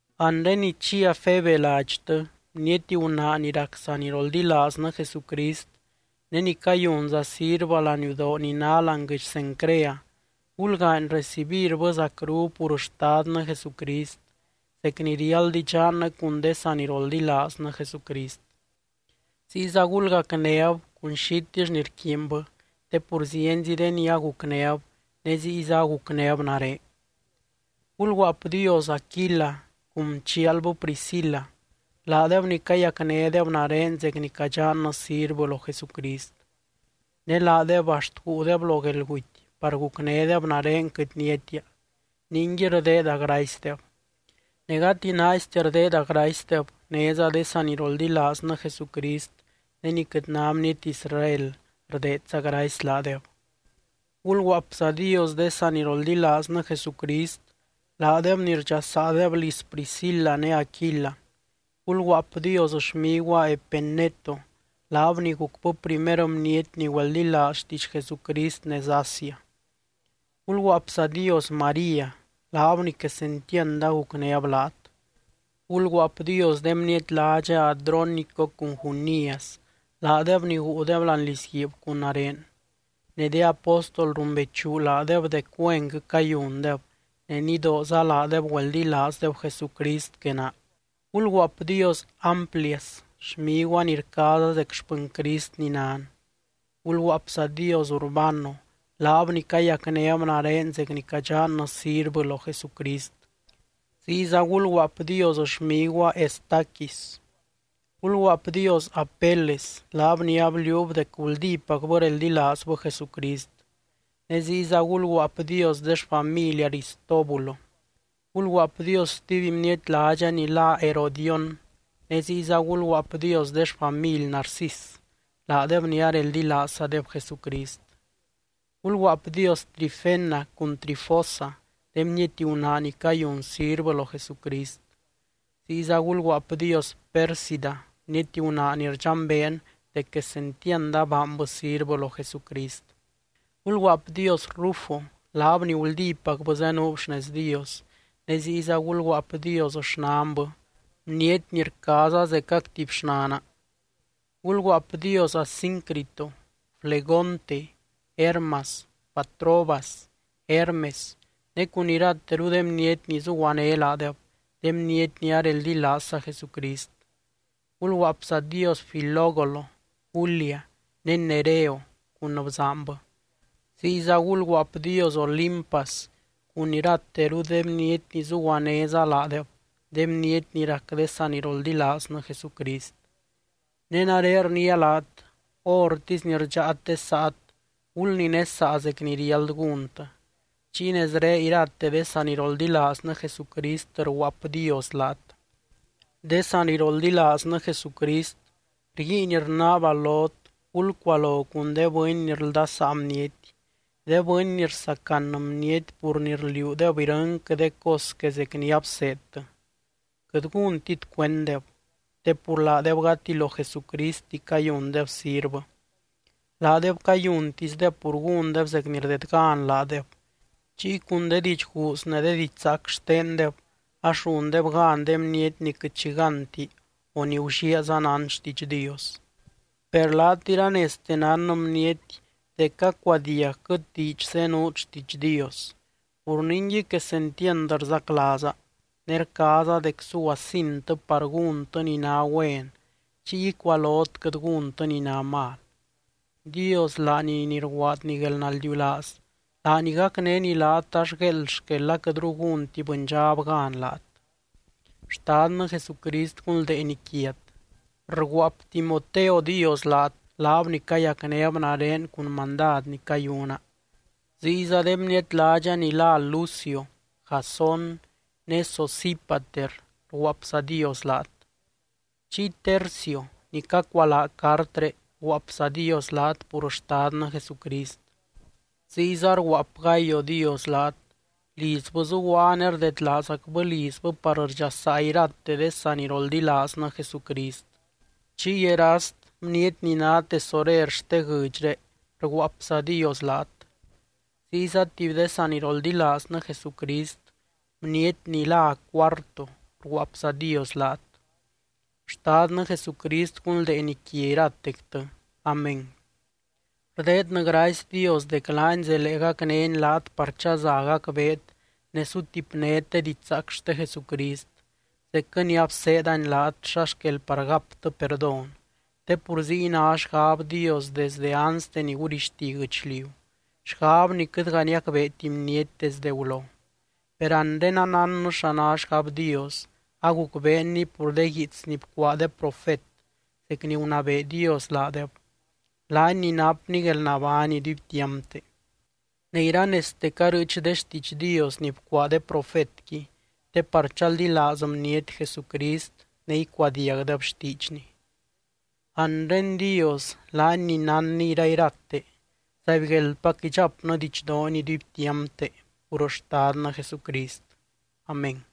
Anre ni chia Febe ladxtɨ, bniety gunaa ni rac saniroldilaaznɨ Jesucrist ne ni cayunza sirvɨ laniudoo ni ná láani guɨdx Cencrea. Gulgaany recibirbɨ zacru pur Xtadnɨ Jesucrist, zec ni riáld idxannɨ cun de saniroldilaaznɨ Jesucrist. Ziyza gulgacnéb cun xitill ni rquiinbɨ, te pur zienzi de ni agucnéb ne ziyza agucnéb nare. Gulguaapdios Aquila cun chialbɨ Priscila, laadeb ni cayacnédeb nare zec ni cadxannɨ sirvɨ lo Jesucrist. Ne laadeb axt guudeb lo guelguty par gucnédeb nare quɨt niatia, ningui rdeeda gracydeb. Ne gati naaistia rdeeda gracydeb, néza de saniroldilaaznɨ Jesucrist de ni quɨt ná bniety Israel rdeedza gracy laadeb. Gulguaapzadios de saniroldilaaznɨ Jesucrist, laadeb ni rdxasaadeb liz Priscila ne Aquila. Gulguaapdios xmiguaa Epeneto, laab ni gucbɨ primer bniety ni güeldilaaz xtiidx Jesucrist nez Asia. Gulguaapzadios María, laab ni quesentiand agucnéb laat. Gulguaapdios de bniety ládxa Adrónico cun Junias, laadeb ni guudeb láani lizguiib cun nare. Ne de apóstol rumbeechu laadeb dec güenquɨ cayundeb, ne nidooza laadeb güeldilaazdeb Jesucrist que naa. Gulguaapdios Amplias, xmiguaa ni rcaaza zec xpɨny Crist ni nan. Gulguaapzadios Urbano, laab ni cayacnéb nare zec ni cadxannɨ sirvɨ lo Jesucrist. Ziyza gulguaapdios xmiguaa Estaquis. Gulguaapdios Apeles, laab ni abliuub dec guldípacbɨ reldilaazbɨ Jesucrist, ne ziyza gulguaapdios de xfamily Aristóbulo. Gulguaapdios stuby bniety ládxa ni lá Herodión, ne ziyza gulguaapdios de xfamily Narcis, laadeb ni areldilaazzadeb Jesucrist. Gulguaapdios Trifena cun Trifosa, de bniety gunaa ni cayun sirvɨ lo Jesucrist. Ziyza gulguaapdios Pérsida, bniety gunaa ni rdxambeen dec quesentiand abaanbɨ sirvɨ lo Jesucrist. Gulguaapdios Rufo, laab ni guldípacbɨ zenuub xnez Dios, ne ziyza gulguaapdios xnanbɨ, bniety ni rcaaza zecac tuby xnana. Gulguaapdios Asíncrito, Flegonte, Hermas, Patrobas, Hermes ne cun irateru de bniety ni zuguané laadeb, de bniety ni areldilaazza Jesucrist. Gulguaapzadios Filólogo, Julia ne Nereo cun bzaanbɨ, ziyza gulguaapdios Olimpas cun irateru de bniety ni zuguanéza laadeb, de bniety ni rac de saniroldilaaznɨ Jesucrist. Ne nare rniia laat: Hórtisy ni rdxáat de saat, gulninesaa zec ni riáld gúntɨ. Chiy nezré irate de saniroldilaaznɨ Jesucrist rguaapdios laat. De saniroldilaaznɨ Jesucrist, rguiin rnaaba lot gulcualo cun de bɨny ni rldasaa bniety, de bɨny ni rsacan bniety pur ni rliuudeb irɨnquɨ de cos que zec ni abseedtɨ. Quɨt gúntit cuenddeb, te pur laadeb gati lo Jesucristi cayundeb sirvɨ, laadeb cayuntisdeb pur gúndeb zec ni rdedgan laadeb, chiy cun de diidx guuz ne de diidx zaac xtendeb ax rundeb gan de bniety ni quɨt xi gánti o ni gulliaaza nán xtiidx Dios. Per laat iranezte nán bniety dec cacuadiagquɨt diidx zenuut xtiidx Dios, pur ningui quesentiand rzaclaaza, ne rcaaza dec suguasintɨ par gúntɨ ni ná güen chiy icualot quɨt gúntɨ ni ná mal. Dios laany ni rguaadny guelnaldiulaaz, laany gacnény laat ax gueeld xquel aquɨtru gúnti bɨndxab gan laat. Xtadnɨ Jesucrist gunldeeny quiat. Rguaap Timoteo dios laat, laab ni cayacnéb nare cun mandad ni cayuna, ziyza de bniety ládxa ni lá Lucio, Jasón ne Sosípater rguaapzadios laat. Chiy Tercio ni cacualaa cartré rguaapzadios laat pur Xtadnɨ Jesucrist. Ziyza rguaap Gayo dios laat, lizbɨ zuguaa ne rdedlaazacbɨ lizbɨ par rdxasaa irate de saniroldilaaznɨ Jesucrist. Chiy Erast, bniety ni ná tesorer xte guɨdxré rguaapzadios laat, ziyza tuby de saniroldilaaznɨ Jesucrist, bniety ni lá Cuarto rguaapzadios laat. Xtadnɨ Jesucrist gunldeeny quia iratectɨ. Amén. Rdeednɨ gracy Dios dec laany zelee gacnény laat par chaza gacbeet ne sutipnét de didxzaac xte Jesucrist, zecquɨ ni abseedani laat xa xquel par gaptɨ perdón. Te pur ziy ná xgab Dios desde anste ni gurixti guɨchliu, xgab ni quɨtga niacbeeti bniety desde gulo. Per anre anánnɨ xa ná xgab Dios, agucbeenni pur de guiits ni bcuaa de profet zec ni gunabee Dios laadeb, laany ni napny guelnabány iduibtiampte. Ne iranezte carɨɨch de xtiidx Dios ni bcuaa de profetqui te par chaldilaaz bniety Jesucrist ne icuadiagdeb xtiidxny. Anre Dios, laany ni nánny irairate, ¡zaibgueldpac idxapnɨ didxdoony iduibtiampte pur Xtadnɨ Jesucrist! Amén.